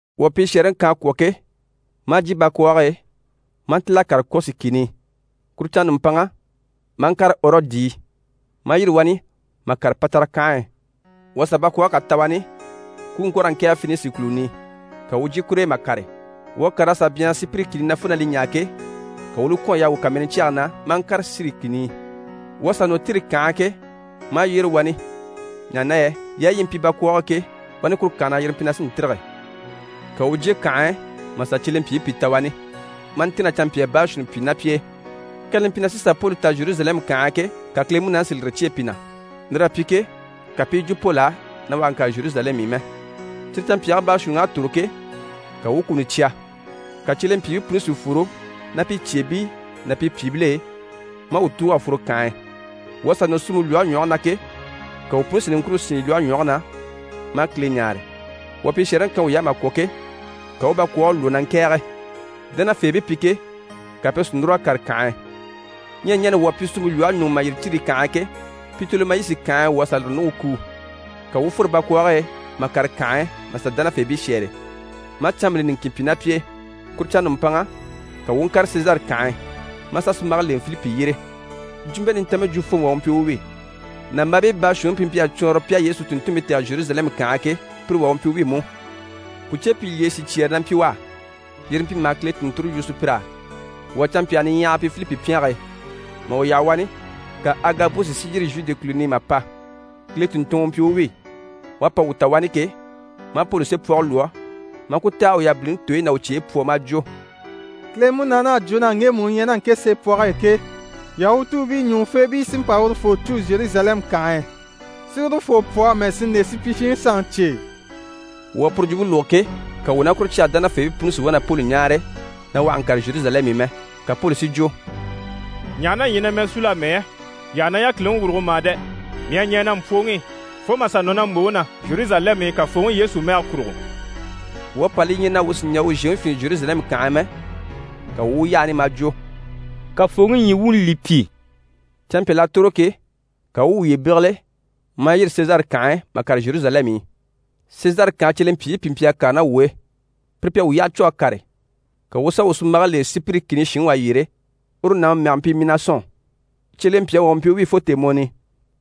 Wuu à pishɛɛreŋi kan a kwɔ̀ ke, maa jyè bakwɔɔge e, maa ntíl'a kàre Kɔsi kìni i. Kuru canŋa nùmpanŋa, maa ŋkàre Ɔrɔdi i, maa yîri wani mà kàre Patara kànhe e. Wuu à sà bakwɔɔge kà ta wani ku u ŋko raa ŋkɛ̀ɛge Fenisi kùluni i, ka wuu u jyè kur'e mà kàre. Wuu à kàr'a sà byanhara Sipiri kìni na fo na li ɲaa ke, ka wuu u li kwɔ̀n a yaha wuu kàmɛnɛ cyɛge na, maa ŋkàre Siri kìni i. Wuu à sà nɔ Tiri kànhe na ke, maa yyére wani, ɲaha na yɛ yaayi yi mpyi bakwɔɔge e ke, wani kuru kànhe na yire mpyi na sí n‑tîrige. Ka wuu u jyè kànhe e mà sà cyelempyiibii pìi ta wani, maa ntɛ̀nn'a canmpyaa baashuunni pyi ná pi e. Kani li mpyi na sí n‑pa Poli ta Zheruzalɛmu kànhe e ke, ka Kile Munaani si lire cyêe pi na. Lir'à pyi ke, ka pi i yi jwo Poli á na u àha ŋkàre Zheruzalɛmu i mɛ. Cyire canmpyaagii baashuunniŋ'à tòro ke, ka wuu u kuni cya. Ka cyelempyiibii puni si fworo ná pi cyeebii ná pi pyìibil'e, maa wuu tùug'a fworo kànhe e. Wuu à sà nɔ suumpe lwɔhe ɲwɔge na ke, ka wuu puni si niŋkure sín lwɔhe ɲwɔge na, maa Kile ɲáare. Wuu à pishɛɛreŋi kan wuy'á mà kwɔ̀ ke, ka wuu u bakwɔɔge lwɔ́ na ŋkɛ̀ɛge. Dánafeebii pi ke, ka pire si núr'a kàre kànhe e. Ɲyɛ ɲani wuu à pyi suumpe lwɔhe ɲuŋ'i mà yîri Tiri kànhe e ke, Pitolemayisi kànhe e wuu à lire ɲùŋke kuu. Ka wuu u fworo bakwɔɔge e mà kàre kànhe e mà sà dánafeebii shɛ́ɛre, maa canmbile niŋkin pyi ná pi e. Kuru canŋa nùmpanŋa, ka wuu u ŋkàre Sezare kànhe e, maa sà sunmbage lèŋɛ Filipi yyére. Jwumpe Nintanmpe jwufooŋi wà u mpyi u wi. Nàmbaabii baashuunniŋi pi mpyi a cwɔɔnrɔ pi a Yesu tùnntunmpii tɛ̀gɛ Zheruzalɛmu kànhe e ke, pire wà u mpyi u wi mú. Pùcepyilyeye sicyɛɛre na mpyi u á, yire mpyi maha Kile tùnnture yu sùpyir'á. Wuu à canmpyaa niɲyahagii pyi Filipi pyɛnge e. Mà wuu yaha wani, ka Agabusi si yîri Zhude kùluni i mà pa. Kile tùnntunŋɔ u mpyi u wi. U à pa wuu ta wani ke, maa Poli seepwɔge lwɔ́, maa ku tɛ̀g'a u yabiliŋi tooyi ná u cyeyi pwɔ maa jwo: «Kile Munaani à jwo na ŋgemu u ɲyɛ ná ŋke seepwɔge e ke, Yahutuubii ɲùŋufeebii sí n‑pa urufoo cû Zheruzalɛmu kànhe e, si urufoo pwɔ amɛ si nde supyishiŋi sanŋi cye e.» Wuu à puru jwumpe lógo ke, ka wuu ná kuru cyage dánafeebii puni si wá na Poli ɲáare na u àha ŋkàre Zheruzalɛmu i mɛ. Ka Poli si jwo: «Ɲaha na yii ɲyɛ na mɛɛ súu amɛ yɛ? Yii àha na yákiliŋi wùrugo mà dɛ! Mii à ɲɛɛ na mpwɔŋi i fo mà sà nɔ na mbòŋi na Zheruzalɛmu i Kafooŋi Yesu mɛge kurugo.» Wuu à pa li ɲya na wuu sì n‑jà u zhèŋi fyìinnɛ Zheruzalɛmu kànhe e mɛ, ka wuu u u yaha wani, maa jwo: «Kafooŋi ɲyii wuuni li pyi.» Canmpyal'à tòro ke, ka wuu u wuye bégele, maa yîri Sezare kànhe e mà kàre Zheruzalɛmu i. Sezare kànhe cyelempyiibii pìi mpyi a kàre ná wuu e. Pire pi à wuu yyaha cû a kàre, ka wuu u sà wuu sunmbage lèŋɛ Sipiri kìni shinŋi wà yyére, uru nàŋi mɛge mpyi Minasɔn. Cyelempyaŋi wà u mpyi u wi fo tèemɔni i.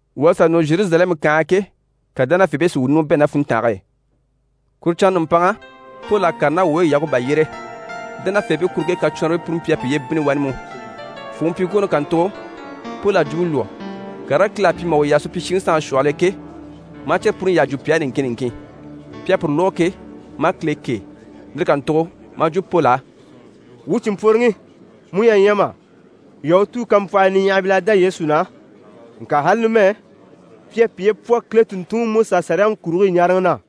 Wuu à sà nɔ Zheruzalɛmu kànhe e ke, ka dánafeebii si wuu ɲùŋɔ bɛ̂ ná funntange e. Kuru canŋa nùmpanŋa, Poli à kàre ná wuu e Yakuba yyére. Dánafeebii kuruŋke kacwɔnribii puni mpyi a piye bínni wani mú. Fwùŋi pyiŋkwooni kàntugo, Poli à jwumpe lwɔ́, karigii Kile à pyi mà u yaha supyishiŋi sanŋi shwɔhɔl'e ke, maa cyire puni yyaha jwo pi á niŋkin niŋkin. Pi à puru lógo ke, maa Kile kêe. Lire kàntugo maa jwo Poli á: «Wuu cìnmpworonaŋi, mu ɲyɛ a ɲya mà? Yahutuu kampwɔhii niɲyahamil'à dá Yesu na naha, ŋka ali numɛ, pi à piye pwɔ Kile tùnntunŋiMusaSaliyaŋi kurigii ɲaaraŋi na.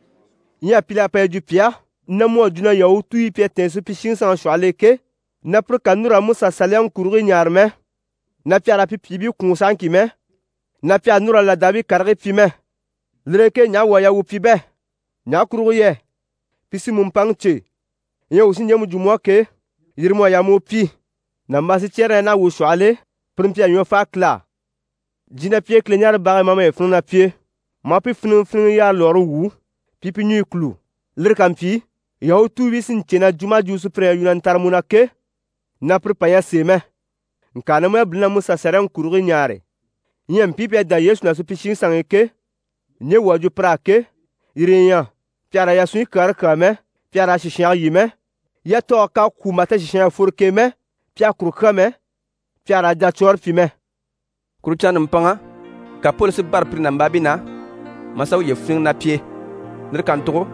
Ɲyɛ pìl'à pa yi jwo pi á na mu à jwo na Yahutuubii pi à tɛ̀ɛn supyishiŋi sanŋi shwɔhɔl'e ke, na pire kà núru raa Musa Saliyaŋi kurigii ɲaare mɛ, na pi àha raa pi pyìibii kwùun sahaŋki mɛ, na pi àha núru raa làdaabii karigii pyi mɛ. Lire e ke ɲaha wuu à yaa wuu pyi bɛ? Ɲaha kurugo yɛ pi sí mu mpaŋi cè. Ɲyɛ wuu sí ɲjemu jwo mu á ke, yire mu à yaa mu u pyi. Nàmbaa sicyɛɛre na ɲyɛ naha wuu shwɔhɔl'e, pire mpyi a ɲwɔ fáa Kile á. Jyè ná pi e Kileɲaarebage e, maa maye fíniŋɛ ná pi e, maa pi fíniŋɛfiniŋɛ yaare lwɔɔre wwû, pi i pi ɲùɲyi kûlu. Lire ká mpyi, Yahutuubii sí n‑cè na jwumɔ maha jwumɔ sùpyire ɲyɛ na yu na ntare mu na ke, na puru pà ɲyɛ sèe mɛ, ŋka na mu yabiliŋi na Musa Saliyaŋi kurigii ɲaare. Ɲyɛ mpii pi à dá Yesu na supyishiŋi sanŋi i ke, ɲje wuu à jwo pir'á ke, yire yi ɲyɛ: pi àha raa yasunɲyi kyaare kyàa mɛ, pi àha raa sìshange lyî mɛ, yatɔɔge k'à kwû mà ta sìshan ɲyɛ a fworo k'e mɛ, pi àha kuru kyà mɛ, pi àha raa jacwɔɔre pyi mɛ.» Kuru canŋa nùmpanŋa, ka Poli si bâra pire nàmbaabii na, maa sà uye fíniŋɛ ná pi e. Lire kàntugo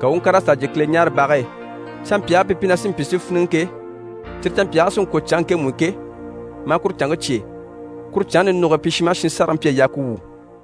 ka u u ŋkàr'a sà jyè Kileɲaarebage e, canmpyaagii pi sí n‑pyi si fíniŋɛ ke, cyire canmpyaagii sí n‑kwɔ̀ canŋke ŋkemu i ke, maa kuru canŋke cyêe. Kuru canŋke ninuge e, pi shin maha shin sárage mpyi a yaa ku wwû.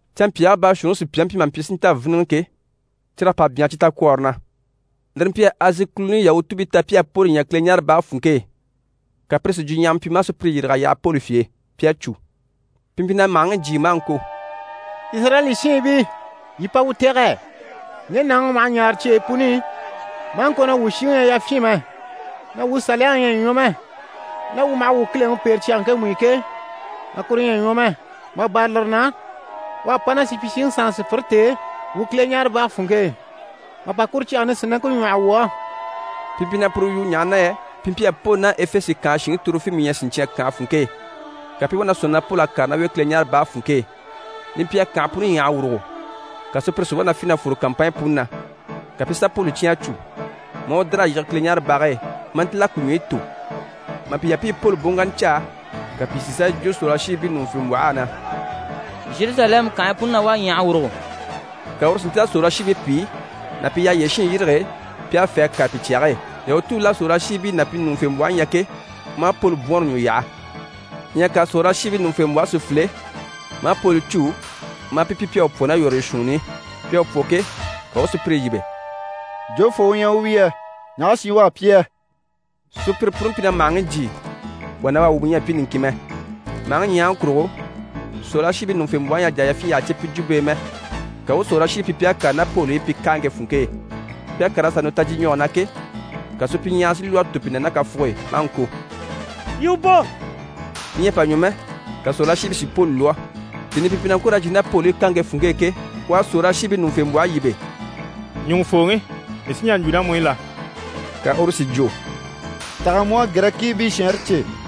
Canmpyaagii baashuunniŋi sùpyaŋi mpyi maha mpyi si nta víniŋɛ ke, cyir'à pa byanhara cyi takwɔɔre na, lire mpyi a Azi kùluni Yahutuubii ta pi à Poli ɲya Kileɲaarebage funŋke e, ka pire si jwuɲyahama pyi maa sùpyire yîrig'a yaha Poli fye e, pi à cû. Pi mpyi na màhaŋi jyii maa ŋko: «Izirayɛli shiinbii, yii pa wuu tɛ̀gɛ! Ŋge nàŋi u maha ɲaare cyeyi puni i maa ŋko na wuu shiŋi ɲyɛ yafyin mɛ, na wuu Saliyaŋi ɲyɛ a ɲwɔ mɛ, na wuu maha wuu Kileŋi pêre cyage ŋkemu i ke, na kuru ɲyɛ a ɲwɔ mɛ. Mà bâra lire na, u à pa ná supyishiŋi sanŋi sùpyire t'e wuu Kileɲaarebage funŋke e mà pa kuru cyage nisinaŋke ɲwɔ́hɔ wuu á.» Pi mpyi na puru yu, ɲaha na yɛ pi mpyi a Poli ná Efese kànhe shinŋi Torofimu ɲya siɲcyan kànhe funŋke e, ka pi i wá na sɔ̂nŋi na Poli à kàre ná u e Kileɲaarebage funŋke e. Li mpyi a kànhe puni ɲyàha a wùrugo, ka sùpyire si wá na fî na fwore kàmpanɲyi puni na. Ka pi i sà Poli cyán a cû, maa u dìr'a yige Kileɲaarebage e, maa ntíl'a ku ɲwɔyi tò. Mà pi yaha pi i Poli boŋkanna caa, ka pìi si sà yi jwo sòrolashiibii ɲùŋufembwɔh'á na: «Zheruzalɛmu kànhe puni na wá a ɲyàha a wùrugo!» Ka uru si ntíl'a sòrolashiibii pìi ná pi yyaha yyére shiin yîrige pi a fê a kàre pi cyage e. Yahutuubil'à sòrolashiibii ná pi ɲùŋufembwɔhe ɲya ke, maa Poli bwɔɔnre ɲwɔ yaha. Ɲyɛ ka sòrolashiibii ɲùŋufembwɔhe si file, maa Poli cû, maa pi pyi pi à u pwɔ ná yɔ̀rɔyɔ shuunni i. Pi à u pwɔ ke, ka u u sùpyire yíbe: «Jofoo u ɲyɛ u wi yɛ? Ɲaha shi u à pyi yɛ?» Sùpyire puni mpyi na màhaŋi jyii, wà ná wà wumɔ ɲyɛ a mpyi niŋkin mɛ. Màhaŋi ɲyahaŋi kurugo, sòrolashiibii ɲùŋufembwɔhe ɲyɛ a jà a yafyin yyaha cè pi jwumpe e mɛ, ka u u sòrolashiibii pyi pi à kàre ná Poli i pi káaŋke funŋke e. Pi à kàr'a sà nɔ tajyiɲwɔge na ke, ka supyiɲyahara si lwɔ́ a tò pi na ná kafuge e, maa ŋko: «Yii u bò!» Li ɲyɛ a pa ɲwɔ mɛ, ka sòrolashiibii si Poli lwɔ́. Tèni i pi mpyi na ŋko raa jyè ná Poli i káaŋke funŋke e ke, u à sòrolashiibii ɲùŋufembwɔhe yíbe: «Ɲùŋufooŋi, mii sí n‑jà n‑jwo ná mu i la?» Ka uru si jwo: «Taha mu à Girɛkiibii shɛɛnre cè?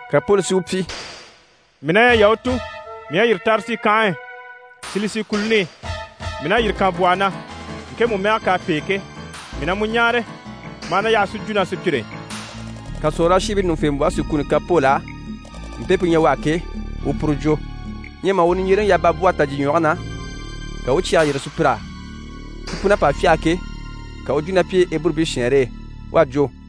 Ka Poli si u pyi: «Mii na ɲyɛ Yahutu, mii à yîri Tarisi kànhe e, Silisi kùluni i. Mii na yîri kànbwɔhɔ na, ŋkemu mɛgɛ k'à pêe ke. Mii na mu ɲáare, ma a na yaha si ɲjwo ná sùpyire e.» Ka sòrolashiibii ɲùŋufembwɔhe si kuni kan Poli á, mpe pu ɲyɛ u á ke, u u puru jwo. Ɲyɛ mà u niɲjyereŋi yaha babwɔhe tajyiɲwɔge na, ka u u cyɛge yîrige sùpyir'á. Pi pun'à pa fyâha ke, ka u u jwo ná pi e Eburubii shɛɛnre e. U à jwo: